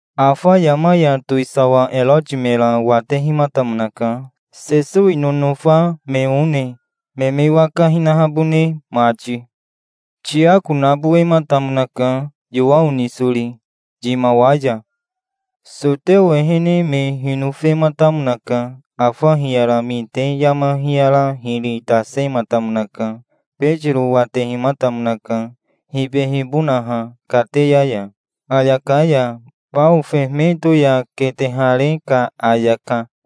Afa yama ya towisawa Eroti mera watehimatamonaka, Sesowi nonofa me one, me me waka hinahabone mati. Tiako nabowematamonaka, Yowao nisori, yimawa ya. Soteo ehene me hinofematamonaka. Afa hiyara mite yama hiyara hiri tasematamonaka. Betiro watehimatamonaka, hibehibonaha kateya ya, ayaka ya, bao fehemeto ya ketehare ka ayaka.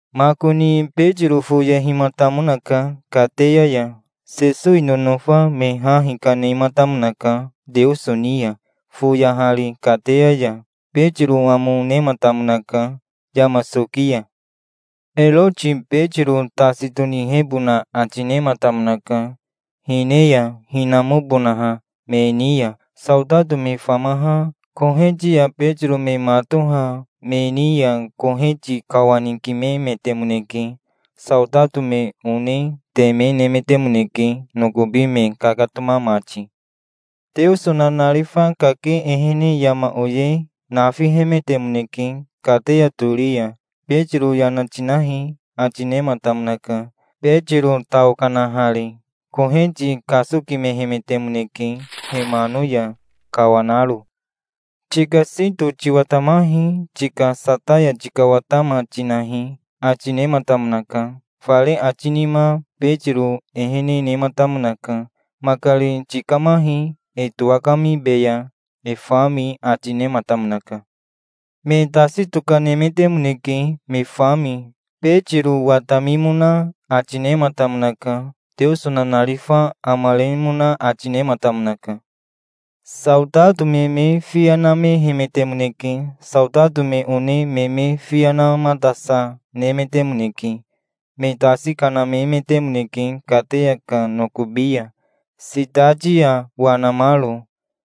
Makoni Betiro foyehimatamonaka kateya ya. Sesowi nonofa me ha hikanematamonaka Teoso ni ya, foyahari kateya ya. Betiro amo nematamonaka yama soki ya. Eroti Betiro tasi tonihebona ati nematamonaka, hine ya hinamobonaha me ni ya. Saotato me famaha koheti ya Betiro me matoha me ni ya koheti kawanikimemetemoneke. Saotato me one teme nemetemoneke nokobi me kakatoma mati. Teoso nanarifa kake ehene yama oye nafihemetemoneke kateya tori ya. "Betiro yana tinahi", ati nematamonaka, Betiro tao kanahari. Koheti kasokimehemetemoneke, he mano ya kawanaro. "Tika sito tiwatamahi. Tika sataya tikawatama, tinahi", ati nematamonaka. Fare ati nima Betiro ehene nematamonaka. "Makari tikamahi. E towakamibeya, e fami", ati nematamonaka. Me tasi tokanemetemoneke, me fami. Betiro watamimona ati nematamonaka. Teoso nanarifa amaremona ati nematamonaka. Saotato me me fiya namehemetemoneke. Saotato me one me me fiya namatasa, nemetemoneke. Me tasi kanamemetemoneke kateya ka nokobi ya, sitati ya wanamaro,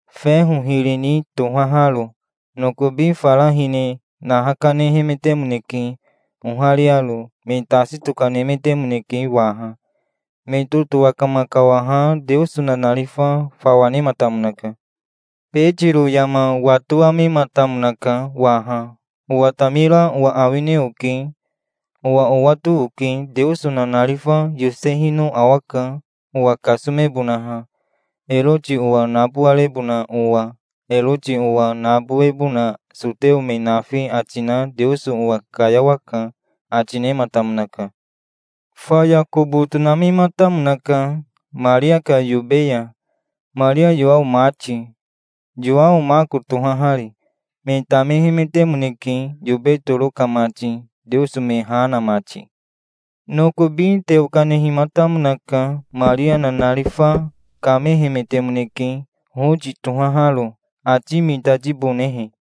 feho hiri ni tohaharo. Nokobi fara hine naha kanehemetemoneke, ohariaro. Me tasi tokanemetemoneke waha. Me totowakama kawaha Teoso nanarifa fawa nematamonaka. Betiro yama watowamematamonaka waha. "Owatamira owa awine oke. Owa owato oke. Teoso nanarifa yosehino awaka, owa kasomebonaha, Eroti owa nabowarebona owa. Eroti owa nabowebona Soteo me nafi ati na Teoso owa kayawaka", ati nematamonaka. Faya kobo tonamematamonaka Maria ka yobe ya, Maria Yowao mati, Yowao Mako tohahari. Me tamehemetemoneke, yobe toro ka mati, Teoso me ha na mati. Nokobi teo kanehimatamonaka. Maria nanarifa kamehemetemoneke, Hoti tohaharo, ati mitatibonehe.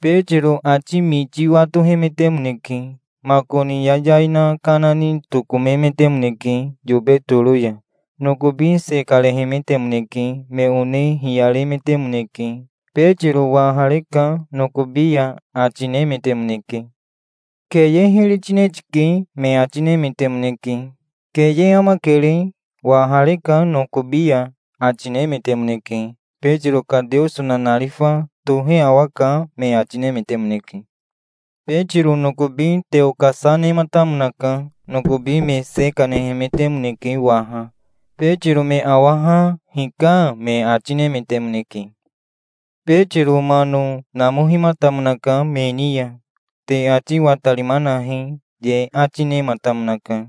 Betiro ati miti watohemetemoneke. Makoni yayai na kana ni tokomemetemoneke yobe toro ya. Nokobi se karehemetemoneke. Me one hiyaremetemoneke. "Betiro wahareka nokobi ya", ati nemetemoneke. "Keye hiri tine tike", me ati nemetemoneke. "Keye amakere. Wahareka nokobi ya", ati nemetemoneke. "Betiro ka Teoso nanarifa tohe awaka", me ati nemetemoneke. Betiro nokobi teo kasa nematamonaka. Nokobi me se kanehemetemoneke waha. Betiro me awaha "Hika", me ati nemetemoneke. Betiro mano namohimatamonaka me ni ya. "Te ati watarima nahi", ye ati nematamonaka.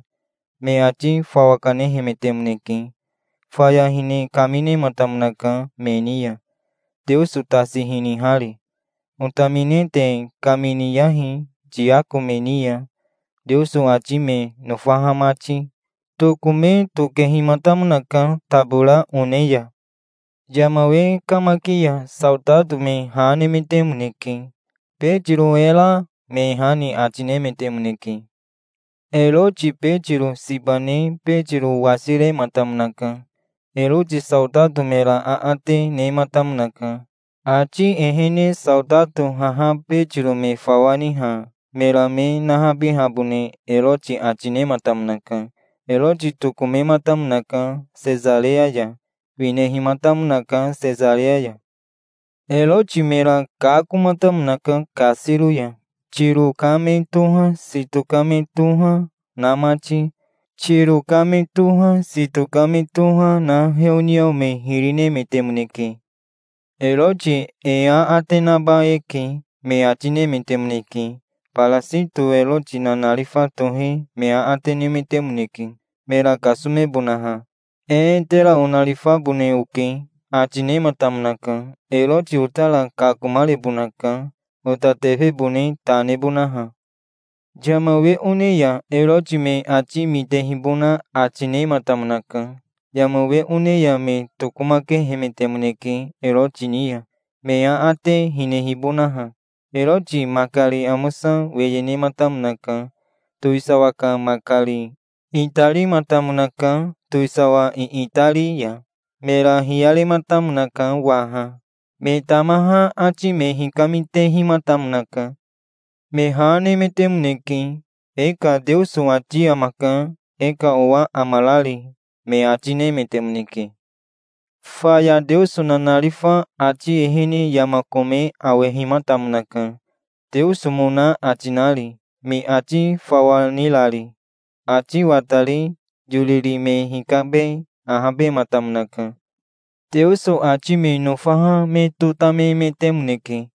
Me ati fawa kanehemetemoneke. Faya hine kaminematamonaka me ni ya, Teoso tasi hinihari. "Otamine te kaminiyahi Tiako me ni ya, Teoso ati me nofaha mati". Tokome tokehimatamonaka tabora one ya. Yama we kamaki ya saotato me ha nemetemoneke. "Betiro e ra?" me ha ni ati nemetemoneke. Eroti Betiro siba ne Betiro wasirematamonaka. Eroti saotato mera aate nematamonaka. Ati ehene saotato haha Betiro me fawa niha mera me nahabihabone Eroti ati nematamonaka. Eroti tokomematamonaka Sesareya ya. Winehimatamonaka Sesareya ya. Eroti mera kakomatamonaka kasiro ya, Tiro ka me toha, Sito ka me toha, na mati. Tiro ka me toha, Sito ka me toha, na heoniao me hiri nemetemoneke. "Eroti e aate naba eke", me ati nemetemoneke. Barasito Eroti nanarifa tohe me aate nemetemoneke, mera kasomebonaha. "Ee, tera onarifabone oke", ati nematamonaka. "Eroti otara kakomarebonaka, ota tefebone ta nebonaha". Yama we one ya Eroti me ati mitehibona ati nematamonaka. Yama we one ya me tokomakehemetemoneke Eroti ni ya, me aate hinehibonaha. Eroti makari amosa weye nematamonaka, towisawa ka makari. Itarimatamonaka, towisawa iitari ya. Mera hiyarematamonaka waha. Me tamaha ati me hikamitehimatamonaka. Me ha nemetemoneke. "E ka Teoso ati amaka, e ka owa amarari", me ati nemetemoneke. Faya Teoso nanarifa ati ehene yama kome awehimatamonaka, Teosomona ati nari, me ati fawa nirari, ati watari. Yoriri me hikabe ahabematamonaka. Teoso ati me nofaha me totamemetemoneke.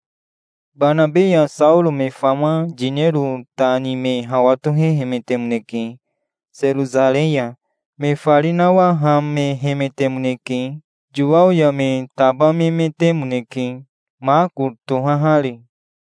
Banabe ya Saoro me fama yinero ta ni me hawa tohehemetemoneke Serosarei ya. Me fari nawahamehemetemoneke. Yowao ya me tabamemetemoneke, Mako tohahari.